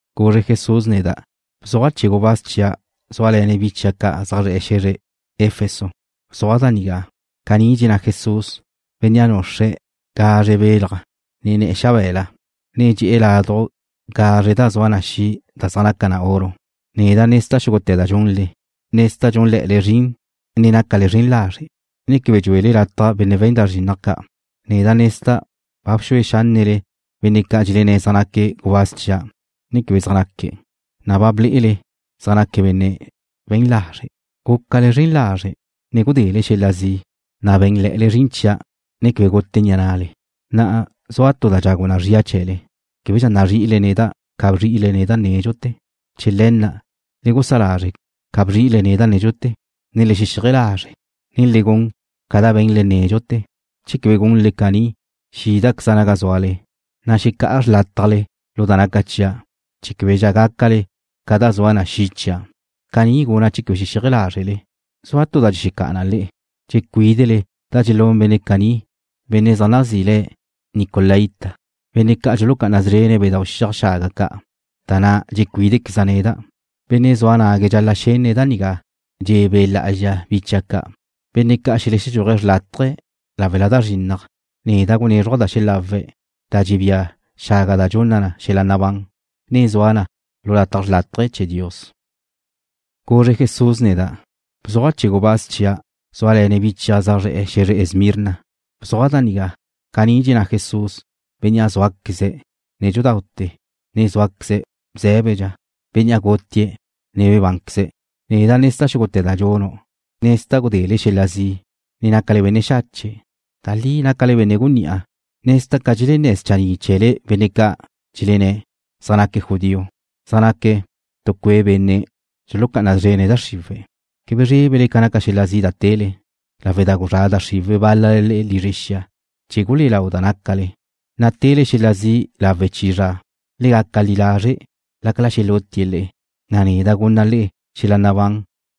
Guzre Jesús neda': ―Bzuaj chee̱ gubáz chia' zúale̱ne̱' bi chia' zaj zre̱'e̱ xe̱zre Efeso. Bzuaj da nigá: Caní dxenná Jesús, Bénnea' nuxre̱' gazre belaj ne̱'e̱ xabe̱la, ne dxedé̱' laduj gazre da zua na xi' da zaj naca na oro. Neda' nezda' xúgute̱ da dxunle. Nezda' dxúnle̱'e̱le zrin ne nácale zren lazre', ne quebe dxuele lataj benne' we̱n da zrinnaj ca'. Neda' nezda' ba bxue xánnele benne' ca' dxelenné̱' zaj naque̱' gubáz chia' ne quebe zaj naque̱', na' ba ble'ele zaj naque̱' benne' we̱n lazre'. Gúcale zren lazre', ne gudele xel-la' zi', na' bé̱nle̱'e̱le zrin chia', ne quebe gute ni'a na'le. Na'a zua tu da dxagu na zria chee̱le, québedxa nazri'ile neda' ca bzri'ile neda' nédxute̱. Chee̱ le̱ na', le gusá lazre' ca bzri'ile neda' nédxute̱, ne le xexíaje lazre', na' le gun ca da be̱nle nédxute̱. Che quebe gunle caní xídaqueza' naga zúale, na' xecá'a xrlátajle lu da naca chia' chee̱ québedxa gácale ca da zua na xi' chia'. Caní guna' che quebe xexíaje lázrele. Zua tu da dxexecá'a na le'e, dxecuídele da dxelún benne' ca' zaj nazí le̱' nicolaíta ca', benne' ca' dxulucá'ana szrene̱' bedau' xiaj xaga ca', da na' dxecuídequeza' neda'. Benne' zua nague̱' dxal-la' xenne̱' da nigá dxe̱ Be' Lá'azxa bi chia' ca'. Benne' ca' xeledxúaje̱' xrlátaje lawe' da zrinnaj, neda' gunézruja' da xelawe̱' da dxebía xaga da dxunna na xel-la' nabán, ne zua na lu lataj xrlátaje chee̱ Dios. Guzre Jesús neda': ―Bzuaj chee̱ gubáz chia' zúale̱ne̱' bi chia' zaj zre̱'e̱ xe̱zre Esmirna. Bzuaj da nigá: Caní dxenná Jesús, Bénnea' zúaqueze̱' nédxudaute̱, ne zúaqueze̱' bzé̱bedxa, Bénnea' gutie̱', ne bebánqueze̱'. Neda' nezda' xúgute̱ da dxunu'. Nezda' gudele xel-la' zi', ne nácale benne' xache'. Da li nácale benne' gunní'a. Nezda' ca dxelenné̱ schanni' chee̱le benne' ca' dxelenné̱' zaj naque̱' judío, san zaj naque̱' tu cue' benne' dxulucá'ana szrene̱' da xriwe̱'. Quebe zrébele ca naca xel-l a' zi' da tele, lawe' da guzrá' da xriwe̱' bál-lale le'e lizre xia chee̱ gulé'e lau da nácale, na' tele xel-la' zi' lawe' chi zra. Le gaca li lazre' lácala xelutie̱' le'e, na' neda' gunna' le'e xel-la' nabán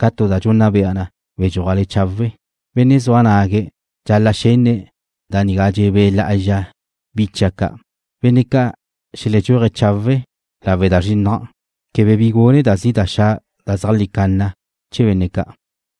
ca tu da dxunna bea na be̱dxuajle chawe'. Benne' zua nague̱' dxal-la' xenne̱' da nigá dxe̱ Be' Lá'azxa bi chia' ca'. Benne' ca' xeledxúaje̱' chawe' lawe' da zrinnaj, quebe bi gune da zi' da xa' da zeajlí canna chee̱ benne' ca'.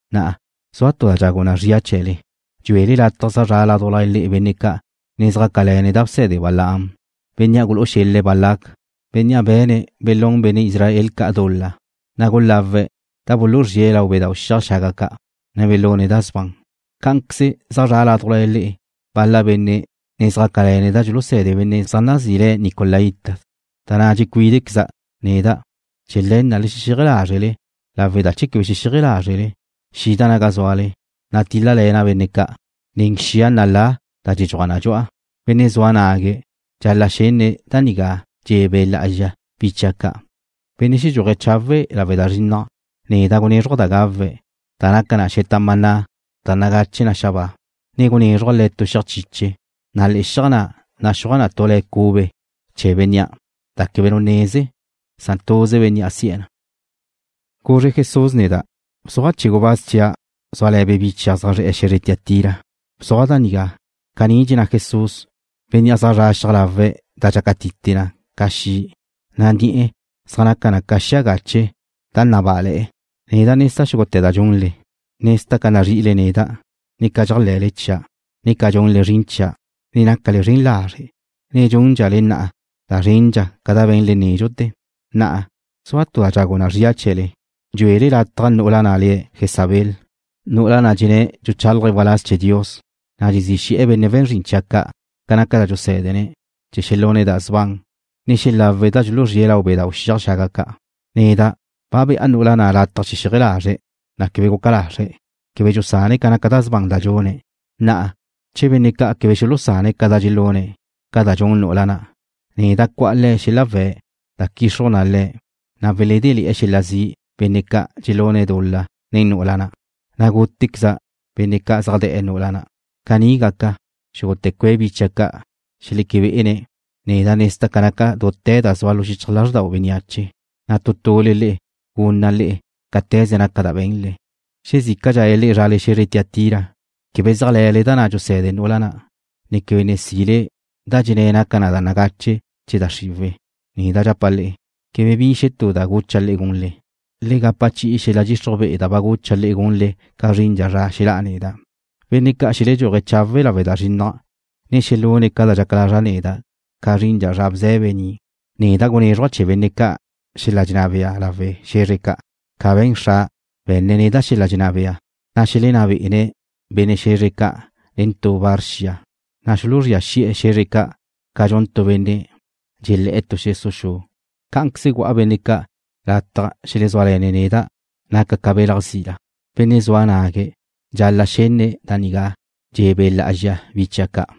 Na'a, zua tu da dxagu na zria chee̱le, dxuele lataj zaj zra' ládujla le'e benne' ca' ne zjácale̱ne̱' da bse̱de Balaam, bénnea' gulú'u xel-le̱' Balac, bennen' be̱ne̱' belún benne' Israel ca' dul-la, na' gulawe̱' da buluzríe̱' lau bedau' xiaj xaga ca', ne belune̱' da sban. Cá'anqueze zaj zra' ládujla le'e bal-la benne' ne zjácale̱ne̱' da dxuluse̱de benne' zaj nazí le̱' nicolaíta, da na' dxecuídequeza' neda'. Chee̱ le̱ na' le xexíaje lázrele lawe' da che quebe xexíaje lázrele xida' naga zúale, na' tíl-lale̱na' benne' ca' nen xia nalá da dxedxuaj na dxu'a. Benne' zua nague̱' dxal-la' xenne̱' da nigá dxe̱ Be' Lá'azxa bi chia' ca'. Benne' xedxuaje̱' chawe' lawe' da zrinnaj, neda' gunézruja' da gawe̱' da naca na xeta maná da nagache na xabáa, ne gunézruja' le̱' tu xiaj chiche, na' le̱'e̱ xiaj na' naxúaj tu la cube chee̱ bénnea', da quebe nu neze, san tuze bénnea' si'e̱ na. Guzre Jesús neda': ―Bzuaj chee̱ gubáz chia' zúale̱ne̱' bi chia' zaj zre̱'e̱ xe̱zre Tiatira. Bzuaj da nigá: Caní dxenná Jesús, Bénnea' zaj zra xiaj lawe̱' da dxelácatite na ca xi', na' ni'e̱ zaj naca na ca xia gache da nabá'ale̱'e̱ na. Neda' nezda' xúgute̱ da dxunle. Nezda' ca nazri'ile neda', ne ca dxéajle̱le chia', ne ca dxunle zrin chia', ne ca nácale zren lazre', na' dxúndxale na'a da zrendxa ca da be̱nle nédxute̱. Na'a, zua tu da dxagu na zria chee̱le, dxuele lataj nu'ula na' le̱' Jezabel, nu'ula na' dxenné̱' dxuchálaje̱' waláz chee̱ Dios, na' dxezí xe̱'e̱ benne' we̱n zrin chia' ca' ca naca da dxusé̱dene̱' chee̱ xelune̱' da sban, ne xelawe̱' da dxuluzríe̱' lau bedau' xiaj xaga ca'. Neda' ba be'a nu'ula na' lataj xexíaje lazre̱', na' quebe guca lazre̱'. Quebe dxusane̱' ca naca da sban da dxune̱'. Na'a, che benne' ca' quebe xulusane̱' ca da dxelune̱' ca dxun nu'ula na', neda' cu'a le̱' xel-la' we̱' da quixruj na le̱', na' weledéle̱'e̱ xel-la' zi' benne' ca' dxelune̱' dul-la nen nu'ula na', na' gútequeza' benne' ca' zaj de̱'e̱ nu'ula na'. Caní gaca, xúgute̱ cue' bi chia' ca' xeleque be'ene̱' neda' nezda' ca naca dute̱ da zua lu xichaj lázrdau bénneache, na' tu tule le'e gunna' le'e cáte̱ze naca da be̱nle. Xezícadxale le'e zrale xe̱zre Tiatira, quebe zéajle̱le da na' dxuse̱de nu'ula na', ne quebe ne sile da dxenné̱' naca na da nagache chee̱ da xriwe̱', neda' dxapa' le'e, quebe bi xetú da gucha' le'e gunle. Le gapa chi'i xel-la' dxixruj be'e da ba gucha' le'e gunle ca zrindxa zra xelá'a neda'. Benne' ca' xeledxúaje̱' chawe' lawe' da zrinnaj, ne xelune̱' ca dxaca lazra' neda' ca zrindxa zra bze̱be ni', neda' gunézruja' chee̱ benne' ca' xel-la' dxenná bea lawe' xe̱zre ca', ca be̱n Xra', be̱nne̱' neda' xel-la' dxenná bea, na' xelenná be'ene̱' benne' xe̱zre ca' nen tu var xia, na' xuluzría xi'e̱ xe̱zre ca' ca dxun tu benne' dxelé̱'e̱ tu xesu' xu. Cá'anqueze gu'a benne' ca' lataj xelezúale̱ne̱' neda', naca' ca belaj zila. Benne' zua nague̱' dxal-la' xenne̱' da nigá dxe̱ Be' Lá'azxa bi chia' ca'.